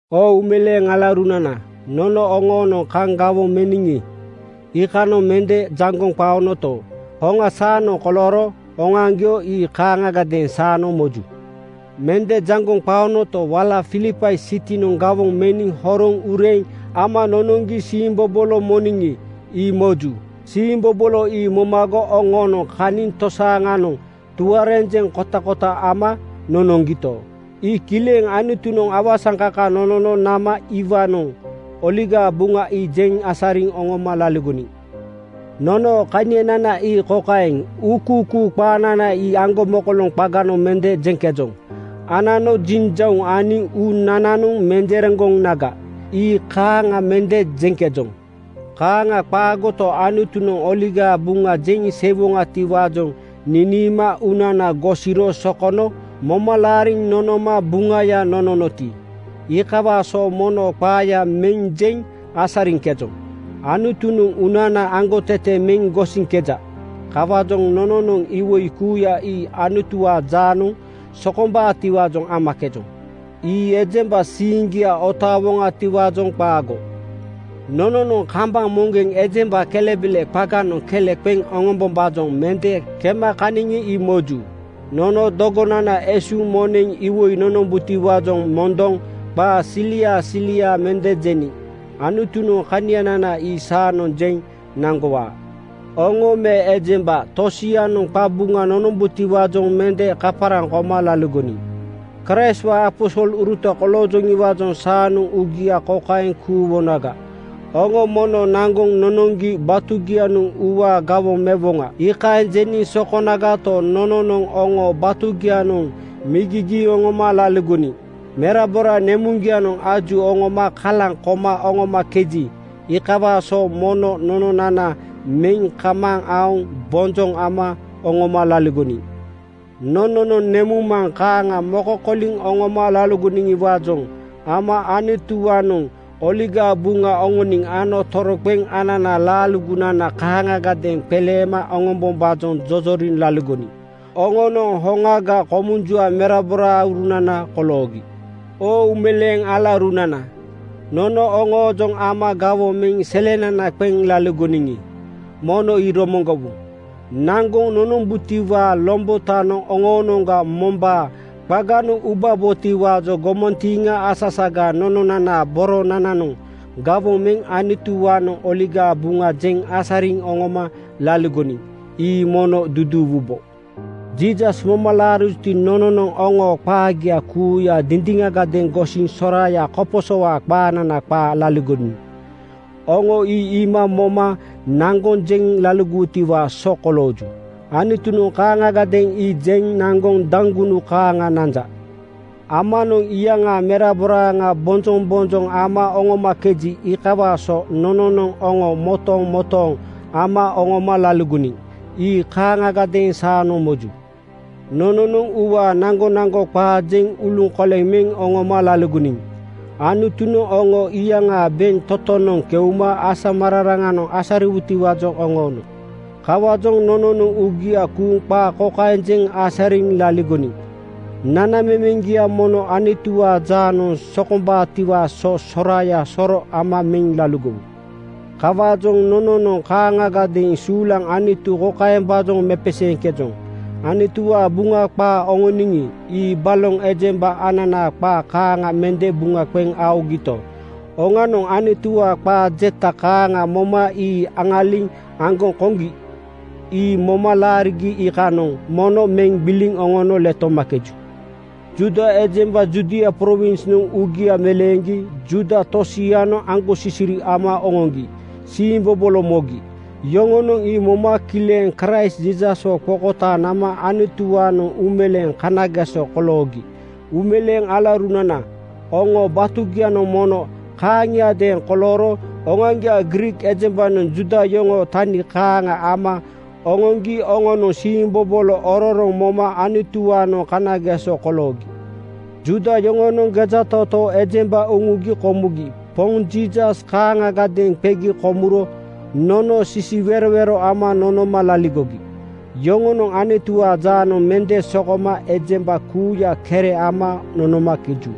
Oo uumeleeŋ alaurunana, nono oŋoonoŋ kaŋ gawoŋ meniŋi, iikanoŋ mende jaŋgoŋ qaonoto, hoŋa saanoŋ kolooro. Oŋoaŋgio ii kaaŋagadeeŋ saanoŋ moju. Mende jaŋgoŋ qaonoto, wala Filipai sitinoŋ gawoŋ meniŋ horoŋ ureeŋ ama nonoŋgi siimbobolo moniŋi, ii moju. Siimbobolo ii momago oŋoonoŋ kaniŋ tosianoŋ tuarenjeŋ kotakota ama nonoŋgito, ii kileŋ Anutunoŋ awasaŋkaka nonono nama iwaanoŋ Oligaa Buŋa ii jeŋ asariŋ oŋoma laligoniŋ. Nonoo kanianana ii kokaeŋ: Uukuukuu qaanana ii aŋgomokoloŋ qaganoŋ mende jeŋkejoŋ. Anano jinjauŋ aniŋ uunananoŋ menjereŋgonaga, ii kaaŋa mende jeŋkejoŋ. Kaaŋa qaagoto, Anutunoŋ Oligaa Buŋa jeŋ seiwoŋatiwaajoŋ niniima uunana gosiro sokono moma laariŋ nonoma Buŋaya nononoti, iikawaa so mono qaaya meŋ jeŋ asariŋkejoŋ. Anutunoŋ uunana aŋgotete meŋ gosiŋkeja. Kawaajoŋ nononoŋ iwoi kuuya ii Anutuwaa jaanoŋ sokomboŋatiwaajoŋ amakejoŋ. Ii ejemba siiŋgia otaawoŋatiwaajoŋ qaago. Nononoŋ kambaŋ moŋgeŋ ejemba kelebele qaanoŋ kele qeŋ oŋombombaajoŋ mende kema kaniŋi, ii moju. Nono dogonana esuuŋ moneŋ iwoi nonombutiwaajoŋ mondoŋ qaa siliaa siliaa mende jeniŋ. Anutunoŋ kanianana ii saanoŋ jeŋ naŋgowaa. Oŋo me ejemba tosianoŋ qabuŋa nonombutiwaajoŋ mende kaparaŋ koma laligoniŋ. Kraistwaa aposoluruta koloojoŋiwaajoŋ saanoŋ uugia kokaeŋ kuuwonaga, “Oŋo mono naŋgoŋ nonoŋgi batugianoŋ uuwaa gawoŋ mewoŋa.” Iikaeŋ jeniŋ sokonagato, nononoŋ oŋoo batugianoŋ migigiiŋ oŋoma laligoniŋ. Merabora nemuŋgianoŋ aju oŋoma kalaŋ koma oŋomakeji, iikawaa so mono nononana meŋ kamaaŋ aoŋ bonjoŋ ama oŋoma laligoniŋ. Nononoŋ nemuŋmaŋ kaaŋa mokokoliŋ oŋoma laligoniŋiwaajoŋ ama Anutuwaanoŋ Oligaa Buŋa oŋoniŋ ano toroqeŋ ananaa laaligonana kaaŋagadeeŋ qeleema oŋombombaajoŋ jojoriŋ laligoniŋ. Oŋonoŋ hoŋaga komunjua meraboraurunana koloogi. Oo uumeleeŋ alaurunana, nono oŋoojoŋ ama gawoŋ meŋ selenana qeŋ laligoniŋi, mono ii romoŋgowu. Naŋgoŋ nonombutiwaa lombotanoŋ oŋoonoŋga mombaa qaganoŋ ubabotiwaajoŋ gomantiiŋa asasaga nononanaa boronananoŋ gawoŋ meŋ Anutuwaanoŋ Oligaa Buŋa jeŋ asariŋ oŋoma laligoniŋ. Ii mono duduuwubo. Jiisas moma laarijuti, nononoŋ oŋoo qaagia kuuya dindiŋagadeeŋ gosiŋ soraaya koposowaa qaanana qaa laligoniŋ. Oŋo ii iima moma naŋgoŋ jeŋ naŋgowutiwaa so kolooju. Anutunoŋ kaaŋagadeeŋ ii jeŋ naŋgoŋ daŋgunu kaaŋa nanja. Amanoŋ iyaŋaa meraboraaŋa bonjoŋbonjoŋ ama oŋomakeji, iikawaa so nononoŋ oŋo motomotooŋ ama oŋoma laligoniŋ. Ii kaaŋiadeeŋ saanoŋ moju. Nononoŋ uuwaa naŋgonaŋgo qaa jeŋ uluŋkoleŋ meŋ oŋoma laligoniŋ. Anutunoŋ oŋo iyaŋaa bentotonoŋ keuma asamararanoŋ asariwutiwaajoŋ oŋoono. Kawaajoŋ nononoŋ uugia kuuŋ qaa kokaeŋ jeŋ asariŋ laligoniŋ, “Nanamemeŋgia mono Anutuwaa jaanoŋ sokombaatiwaa so soraaya soro ama meŋ laligowu.” Kawaajoŋ nononoŋ kaaŋagadeeŋ suulaŋ Anutu kokaembaajoŋ mepeseeŋkejoŋ: Anutuwaa Buŋa qaa oŋoniŋi, ii baloŋ ejemba ananaa qaa kaaŋa mende buŋa qeŋ aogito, oŋanoŋ Anutuwaa qaa jeta kaaŋa moma ii aŋaliŋ aŋgoŋ koŋgi. Ii moma laarigi iikanoŋ mono meŋ gbiliŋ oŋono letomakeju. Juuda ejemba Judia prowinsnoŋ uugia meleeŋgi Juuda tosianoŋ aŋgosisiri ama oŋoŋgi siimbobolo mogi. Yoŋonoŋ ii moma kileŋ Kraist Jiisaswo qokotaaŋ nama Anutuwaanoŋ uumeleeŋ kanageso koloogi. Uumeleeŋ alaurunana, oŋoo batugianoŋ mono kaaŋiadeeŋ kolooro: Oŋoaŋgiaa Griik ejembanoŋ Juuda yoŋoo tani kaaŋa ama oŋoŋgi oŋonoŋ siimbobolo ororoŋ moma Anutuwaanoŋ kanageso koloogi. Juuda yoŋonoŋ gejatootoo ejemba uŋugi komugi Poŋ Jiisas kaaŋagadeeŋ qegi komuro nono sisiwerowero ama nonoma laligogi. Yoŋonoŋ Anutuwaa jaanoŋ mende sokoma ejemba kuuya kere ama nonomakeju.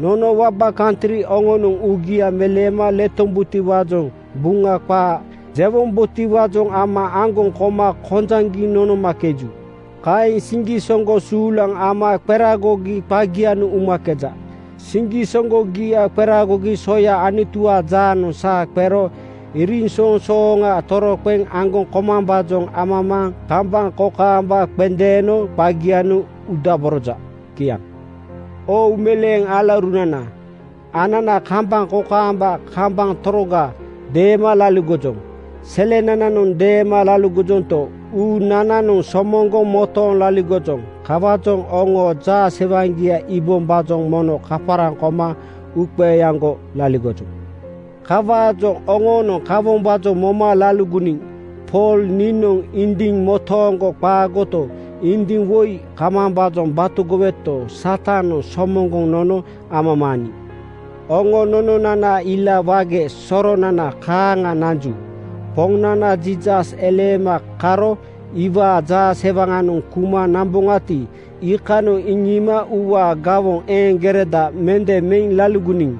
Nono waba kantri oŋonoŋ uugia meleema letombutiwaajoŋ Buŋa qaa jewombotiwaajoŋ ama aŋgoŋ koma kojaŋgiŋ nonomakeju. Kaeŋ siŋgisoŋgo suulaŋ ama qeragogi qagianoŋ umakeja. Siŋgisoŋgogia qeragogi soya Anutuwaa jaanoŋ saa qero iriŋsoŋsooŋa toroqeŋ aŋgoŋ komambaajoŋ amamaaŋ kambaŋ kokaamba qendeeno qagianoŋ udaboroja. Kiaŋ. Oo uumeleeŋ alaurunana, anana kambaŋ kokaamba kambaŋ toroga deema laligojoŋ. Selenananoŋ deema laligojonto, uunananoŋ somoŋgoŋ motooŋ laligojoŋ. Kawaajoŋ oŋoo jaasewaŋgia iibombaajoŋ mono kaparaŋ koma uuqeeaŋgo laligojoŋ. Kawaajoŋ oŋoonoŋ kawombaajoŋ moma laligoniŋ. Pool niinoŋ indiŋ motooŋgo qaagoto, indiŋa woi kamambaajoŋ batogoweto, Satanoŋ somoŋgoŋ nonono amamaaniŋ. Oŋo nononanaanoŋ ila wage soronana kaaŋa nanju. Poŋnana Jiisasnoŋ eleema karo iwaa jaasewaŋanoŋ keuma namboŋati, iikanoŋ iŋiima “Uuwaa gawoŋ eeŋgereda mende meŋ laligoniŋ,”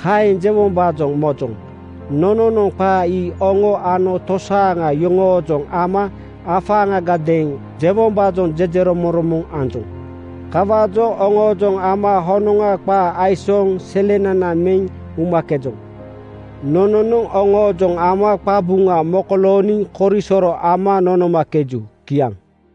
kaeŋ jewombaajoŋ mojoŋ. Nononoŋ qaa ii oŋo ano tosaaŋa yoŋoojoŋ ama afaaŋagadeeŋ jewombaajoŋ jejeromoŋromoŋ anjoŋ. Kawaajoŋ oŋoojoŋ ama honoŋa qaa aisooŋ selenana meŋ umakejoŋ. Nononoŋ oŋoojoŋ ama qabuŋa mokolooniŋ korisoro ama nonomakeju. Kiaŋ.